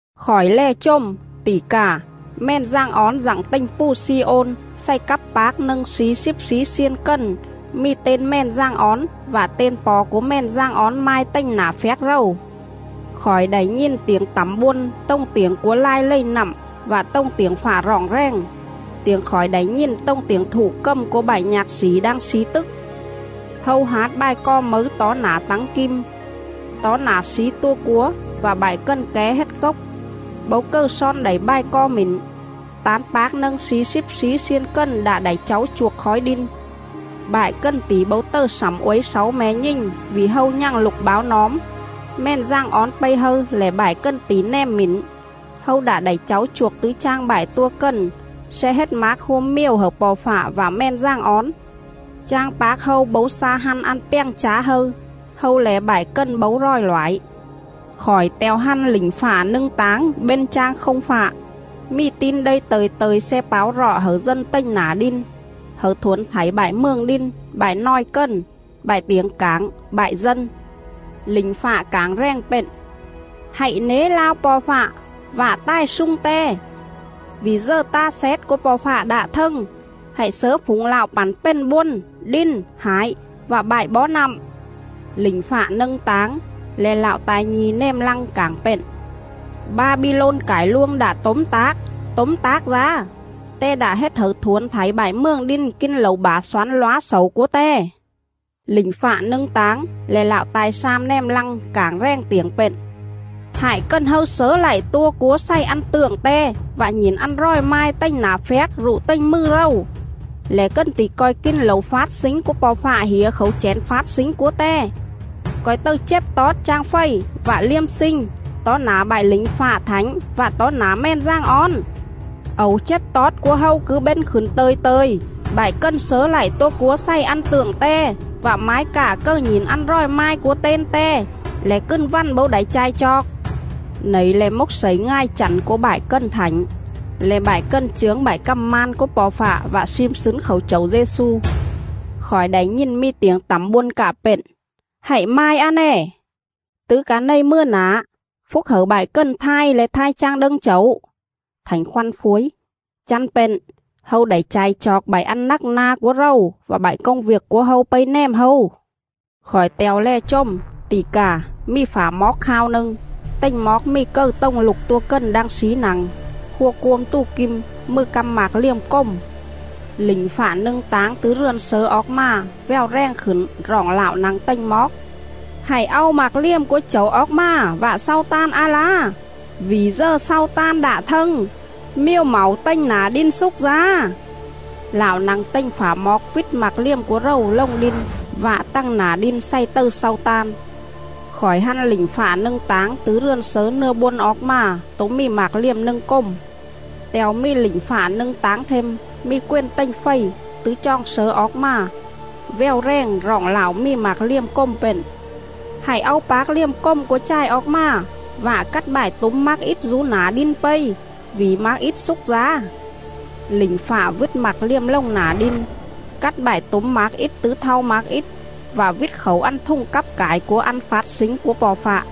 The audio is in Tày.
Khỏi lè chồm, tỉ cà, Mèn Dàng Ón dặng tềnh pù Xi-ôn xày cắp pác nâng slí slíp slí xiên cần mì ten Mèn Dàng Ón vạ ten Po̱ cúa Mèn Dàng Ón mai tềnh nả phjác rầu.. Khỏi đảy nhìn tiểng tẳm bôn tồng tiểng cúa lai lầy nặm vạ tồng tiểng fạ roọng rèng. Tiểng khỏi đảy nhìn tồng tiểng thụ cầm cúa bại nhạc xỉ đang slí tức. Hâu hát bài co mấư tó nả tắng kim, tó nả slí tua cúa vạ bại cần ké hết cốc. Bấu cầư slon đảy bài co mỉn, tán pác nâng slí slíp slí xiên cần đạ đảy cháu chuôc khói đin. Bại cần tỉ bấu tầư slẳm uối xáu me̱ nhình vỉ hâu nhằng lục báo nóm. Mèn Dàng Ón pây hâư lẻ bại cần tỉ nèm mỉn. Hâu đạ đảy cháu chuôc tứ chang bại tua cần sle hết mác hua miều hẩư Po̱ Fạ vạ Mèn Dàng Ón. Chang pác hâu bấu xa hăn ăn pjàng chá hâư; hâu le̱ bại cần bấu ròi loải.. Khỏi te̱o hăn lỉnh fạ nâng táng bên chang không fạ, mì Tin Đây tơ̱i tơ̱i sle páo rọ hẩư dân tềnh nả đin, hẩư thuổn thảy bại mường đin, bại nòi cần, bại tiểng cảng, bại dân. Lỉnh fạ cảng rèng pện: “Hạy nế lao Po̱ Fạ vạ tài slung Te, vỉ dờ ta xét cúa Po̱ Fạ đạ thâng. Hạy slớ phủng Lạo pẳn pền bôn, đin, hải vạ bại bó nặm.” Lỉnh fạ nâng táng, le̱ lạo ta̱i nhi̱ nèm lăng, cảng pện: “Ba-bi-lôn cải luông đạ tốm tác, tốm tác dá! Te đạ hết hẩư thuổn thảy bại mường đin kin lẩu bả xoán lóa xẩu cúa te.”. Lỉnh fạ nâng táng, le̱ lạo ta̱i slam nèm lăng, cảng rèng tiểng pện: “Hại cần hâư slớ lạy tua cúa xày ăn tượng te vạ nhỉn ăn ròi mai tềnh nả phjác rụ tềnh mừ rầu, lẻ cần tỉ co̱i kin lẩu fát slính cúa Po̱ Fạ hỉa khảu chẻn fát slính cúa Te, co̱i tầư chếp tót chang fầy vạ liêm slinh tó nả bại lỉnh fạ thảnh vạ tó nả Mèn Dàng Ón.. Ẩu chếp tót cúa hâu cứ bên khửn tơ̱i tơ̱i. Bại cần slớ lạy tua cúa xày ăn tượng te, vạ mái cạ cầư nhỉn ăn ròi mai cúa ten te, lẻ cừn vằn bấu đảy cha̱i chooc.”. Nẩy le̱ mốc slẩy ngài chẳn cúa bại cần thảnh, le̱ bại cần chướng bại cằm man cúa Po̱ Fạ vạ slim slứn khảu Chẩu Dê-xu. Khỏi đảy nhìn mì tiểng tẳm bôn cạ pện: “Hạy mai a nè: Tứ ca này mừa nả, phúc hẩư bại cần thai le̱ thai chang đâng Chẩu!” Thảnh Khoăn phuối: “Chăn pện, hâu đảy cha̱i chooc bại ăn nắc na cúa rầu vạ bại công viêc cúa hâu pây nèm hâu.” Khỏi te̱o lè chồm, tỉ cà, mì phả moóc khao nâng; tềnh moóc mì cầư tồng Lục Tua Cần đang slí nă̱ng, hua cuôm tù kim, mừ căm mạc liềm cồm.. Lỉnh fạ nâng táng tứ rườn slớ oóc mà, vèo rèng khửn roọng Lạo nă̱ng tềnh moóc: “Hạy au mạc liềm cúa Chẩu oóc mà vạ slau tan a lá vỉ dờ slau tan đạ thâng, miều mảu tềnh nả đin slúc dá.”. Lạo nă̱ng tềnh phả moóc vít mạc liềm cúa rầu lồng đin vạ tằng nả đin xày tầư slau tan. Khỏi hăn lỉnh fạ nâng táng tứ rườn slớ nưa bôn oóc mà tố mì mạc liềm nâng cồm. Te̱o mì lỉnh fạ nâng táng them, mì quền tềnh fầy, tứ choòng slớ oóc mà, vèo rèng roọng lạo mì mạc liềm cồm pện: “Hạy au pác liềm cồm cúa chài oóc mà vạ cắt bại túm mác ít dú nả đin pây, vỉ mác ít slúc dá.” Lỉnh fạ vít mạc liềm lồng nả đin, cắt bại túm mác ít tứ thau mác ít, vạ vít khảu ăn thùng cắp cải cúa ăn fát slính cúa Po̱ Fạ.